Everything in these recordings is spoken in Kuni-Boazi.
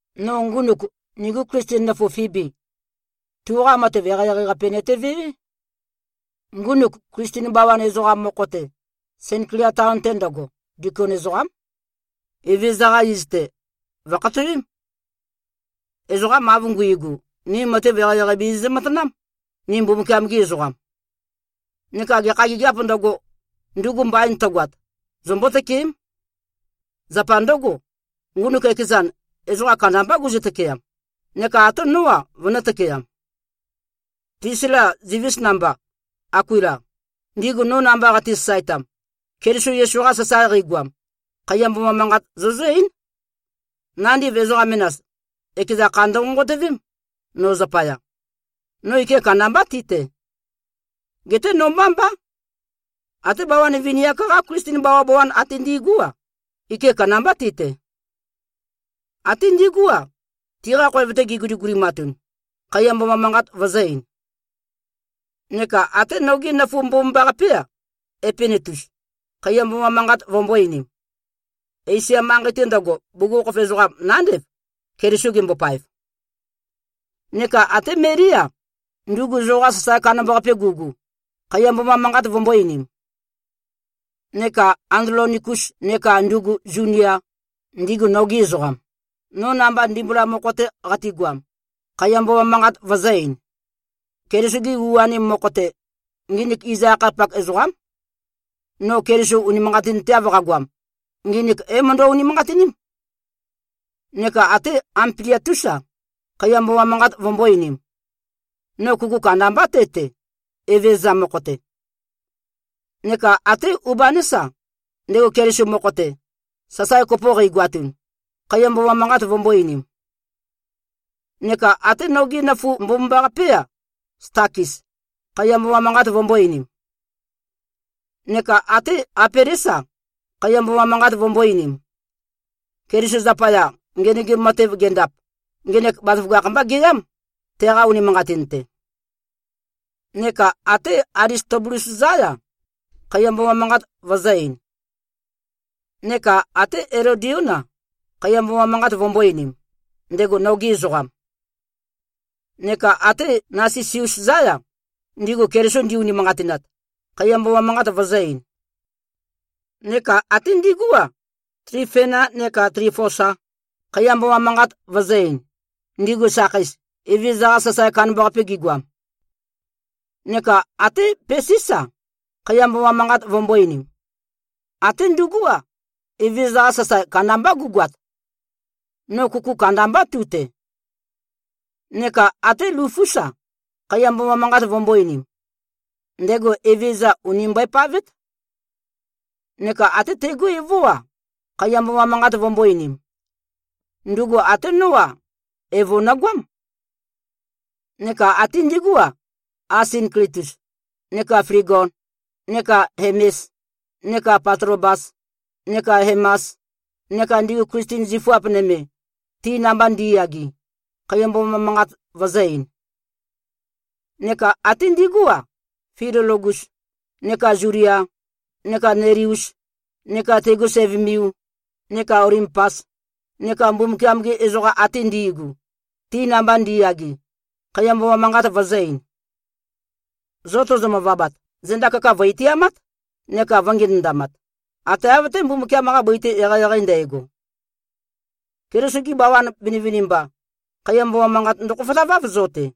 No ngunuk, nigu Klisten nøfu Fibi, tuqa matev eqeieqei-qape nøtevewé. Ngunuk, Klisten bawan ezoqam mokho-te, Senklia taon-te ndøgo, dikon ezoqám. Evezøza-qa iz-te, vø̀khatowém. Ezoqam av nguigu, ni matev eqeieqei bizizø-matanám, ni Mbumbukiam-gi ezoqam. Neka gekha gigiāp ndøgo, ndugu mbain tøgoat, zombó-tøkeém. Zapa ndǿgo, ngunuk ekezan, ezoqa kandambá guzø-tøkeam, neka até nó-a, vønø̄-tøkeam. Plisila, zivis namba, Akuila, ndigu no namba qati-sasaetam, Keliso Yesu-qa sasae qeigoam, khaiya mboma manqat zozǿ-eín. Nandiv ezoqa menas, ekeza kha ndønqonqotøvém, no zapaya. No ike kandambá ti-te. Geté no mbá mbá. Até bawan vini-ak-qa Klisten bawabawan ate ndi꞉gú-a, ike kandambá ti-te. Até ndigú-a, tiqa khoev-te giguligulimatun, khaiya mboma manqat vøzø̄-ein. Neka até nogé nøfu mbomambaqapé-a, Epenetus, khaiya mboma manqat vømbō-einim. Esia manqei-te ndøgo, bugukhokhof ezoqam nándev, Keliso gembopaev. Neka até Melí-a, ndugu zoqa sasae kandambaqape gugu, khaiya mboma manqat vømbō-einim. Neka Andlonikus neka ndugu Zunia, ndigu nogi ezoqam, no namba ndimbula mokho-te qatigoam, khaiya mboma manqat vøzø̄-ein. Keliso-gi u-anim mokho-te, nginik iz-akhayapak ezoqám. No Keliso unimanqatinteav qagoam, nginik é-møndø-unimanqatiním. Neka até Ampliatús-a, khaiya mboma manqat vømbō-einim. No kuku kandambá te-te, Evezøza mokho-te. Neka até Ubanés-a, ndego Keliso mokho-te, sasae kopo qeigoatun, khaiya mboma manqat vømbō-einim. Neka até nogé nøfu mbomambaqapé-a, Stakis, khaiya mboma manqat vømbō-einim. Neka até Apelés-a, khaiya mboma manqat vømbō-einim. Keliso zapaya, ngenøgim matev gendap, ngenek bazaføgakh-mbá geyám, teqa unimanqatin-te. Neka até Alistobulus-zá-ya, khaiya mboma manqat vøzø̄-ein. Neka até Elodión-a, khaiya mboma manqat vømbō-einim, ndego noge ezoqam. Neka até Nasisus-zá-ya, ndigu Keliso ndi-unimanqatinat, khaiya mboma manqat vøzø̄-ein. Neka até ndigú-a, Tlifena neka Tlifosa, khaiya mboma manqat vøzø̄-ein, ndigu sakheis, Evezøza-qa sasae kandambaqape gigoam. Neka até Pesís-a, khaiya mboma manqat vømbō-einim. Até ndugú-a, Evezøza-qa sasae kandambá gugoat. No kuku kandambá tu-te. Neka até Lufús-a, khaiya mboma manqat vømbō-einim. Ndego Evezøza ùni mbøepavét. Neka até tegú evó-a, khaiya mboma manqat vømbō-einim. Ndugu até nó-a, evo nøgoám. Neka até ndigú-a, Asinklitus neka Flegon neka Hemes neka Patlobas neka Hemas neka ndigu Klisten zifuap nøme, ti namba ndi꞉yage, khaiya mboma manqat vøzø̄-ein. Neka até ndigú-a, Filologus neka Zulia neka Neleus neka tegu sævømiu neka Olimpas neka Mbumbukiam-gi ezoqa ate ndi꞉gu, ti namba ndi꞉yage, khaiya mboma manqat vøzø̄-ein. Zo tozo-møvabat, zenda kaka vø̀-itiamát, neka vø̄ngenøndamat, ate av-té, Mbumbukiam-qa bøi-te eqeieqei ndægo. Keliso-gi bawan vinivinimba, khaiya mboma manqat ndøkhofotaváv, zo-te.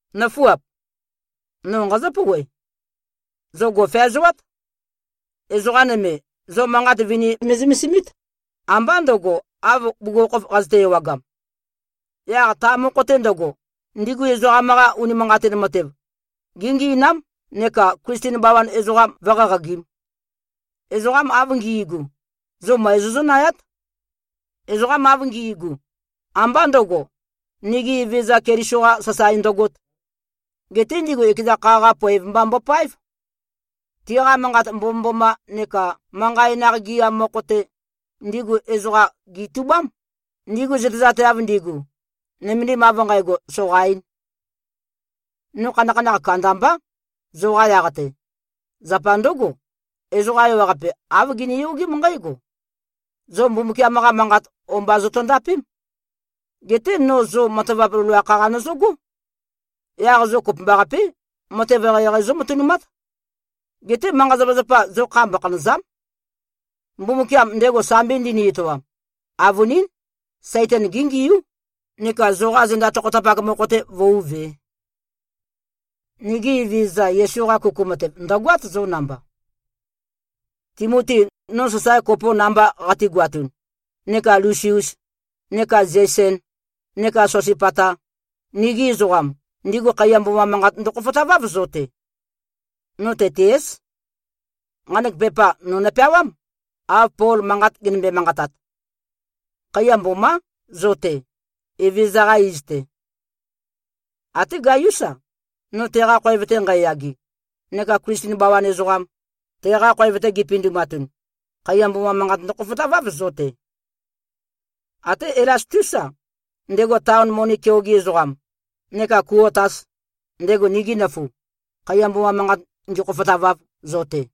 Nǿfuap! No nqazǿ-pouwe. Zo gò꞉feazoát. Ezoqa nøme, zo manqat vini me꞉zømesimít, ambá ndø̄go, av bugukhokhof qazøte-ewagam. Yaq ta mokho-te ndøgo, ndigu ezoqam-qa unimanqatin matev géngi꞉nám neka Klisten bawan ezoqam vǿ-qaqagīm. Ezoqam av ngi꞉gu, zo møe zozǿnayát. Ezoqam av ngi꞉gu, ambá ndø̄go, nigi Evezøza Keliso-qa sasae ndøgōt. Geté ndigu ekeza kha-qa poev mba mbopáev. Tiqa manqat mbomømboma neka manqa enaq gɨam mokho-te, ndigu ezoqa gètubám, ndigu zøtezateav ndigu, nømendim av nqægo soqaīn. No khanakhanakh kandambá, zoqa yaq-te. Zapa ndǿgo, ezoqa ewaqape, āv giniyogém nqǽgo: Zo Mbumbukiam-qa Manqat o-mba zotondapém. Geté no zo matavap loloakh-qa nøzøgó. Yaq zo kopømbaqapé, matev eqeieqei zómatønumát. Geté manqa-zapazapa, zo kha mbokhanø̀za᷄m. Mbumbukiam, ndego sambi ndini-etoam, avønín, Saitan géngiú, neka zoqa zenda tokhotapak mokho-te vǿuvē. Nigi Evezøza Yesu-qa kuku matev ndø̀goát, zo namba. Timoti, no sasae kopo namba qategoatun neka Lusius neka Zeisen neka Sosipata, nigi ezoqam, ndigu khaiya mboma manqat ndøkhofotaváv, zo-te. No Tetiés. Nqanek pepa no nopeawám, av Pol manqat genømbe-manqatat. Khaiya mbomá, zo-te, Evezøza-qa iz-te. Até Gaiús-a, no teqa khoev-te nqæyage neka Klisten bawan ezoqam, teqa khoev-te gipindumatun, khaiya mboma manqat ndøkhofotaváv zo-te. Até Elastús-a, ndego taon moni keoge ezoqam, neka Kuotas, ndego nigi nøfu, khaiya mboma manqat ngīkhōfōtāvāv, zo-te.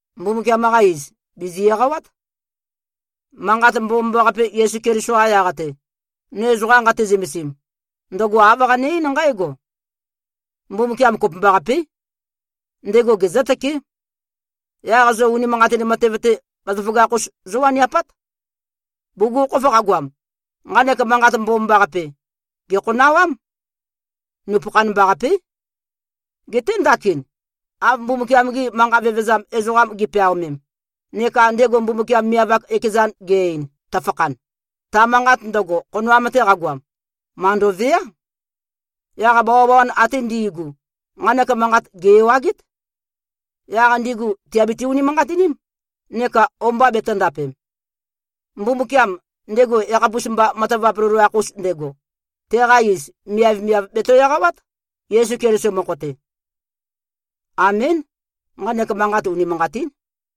Mbumbukiam-qa iz, bìzi-eqawát. Manqat Mbomambaqape, Yesu Keliso-qa yaq-te, no ezoqa nqate-zømesim, ndøgo āv qane-eín nqǽgo: Mbumbukiam kopømbaqapé. Ndego gezǿtøké. Yaq zo unimanqatin matev-te, bazaføgakh-us zówaniapát. Bugukhokhof qagoam, nqanek Manqat Mbomambaqape, gèkhonawám. Nupøkhan-mba-qapé. Geté ndakin, av Mbumbukiam-gi manqa vevezam ezoqam gi꞉peaomem, neka ndego Mbumbukiam miav-ak ekezan ge-ein, tøfakhan, ta manqat ndøgo, khonoam-te qagoam, màndoveá. Yaq bawabawan ate ndi꞉gu, nqanek manqat gè-ewagét. Yaq ndigu tìabiti-unimanqatiním, neka o-mba betø̄ndapem. Mbumbukiam, ndego yakhapus-mba matavap loloakh-us ndego, teqa iz, miavmiav, bèto-eqawát, Yesu Keliso mokho-te. Amén. Nqanek manqat unimanqatín.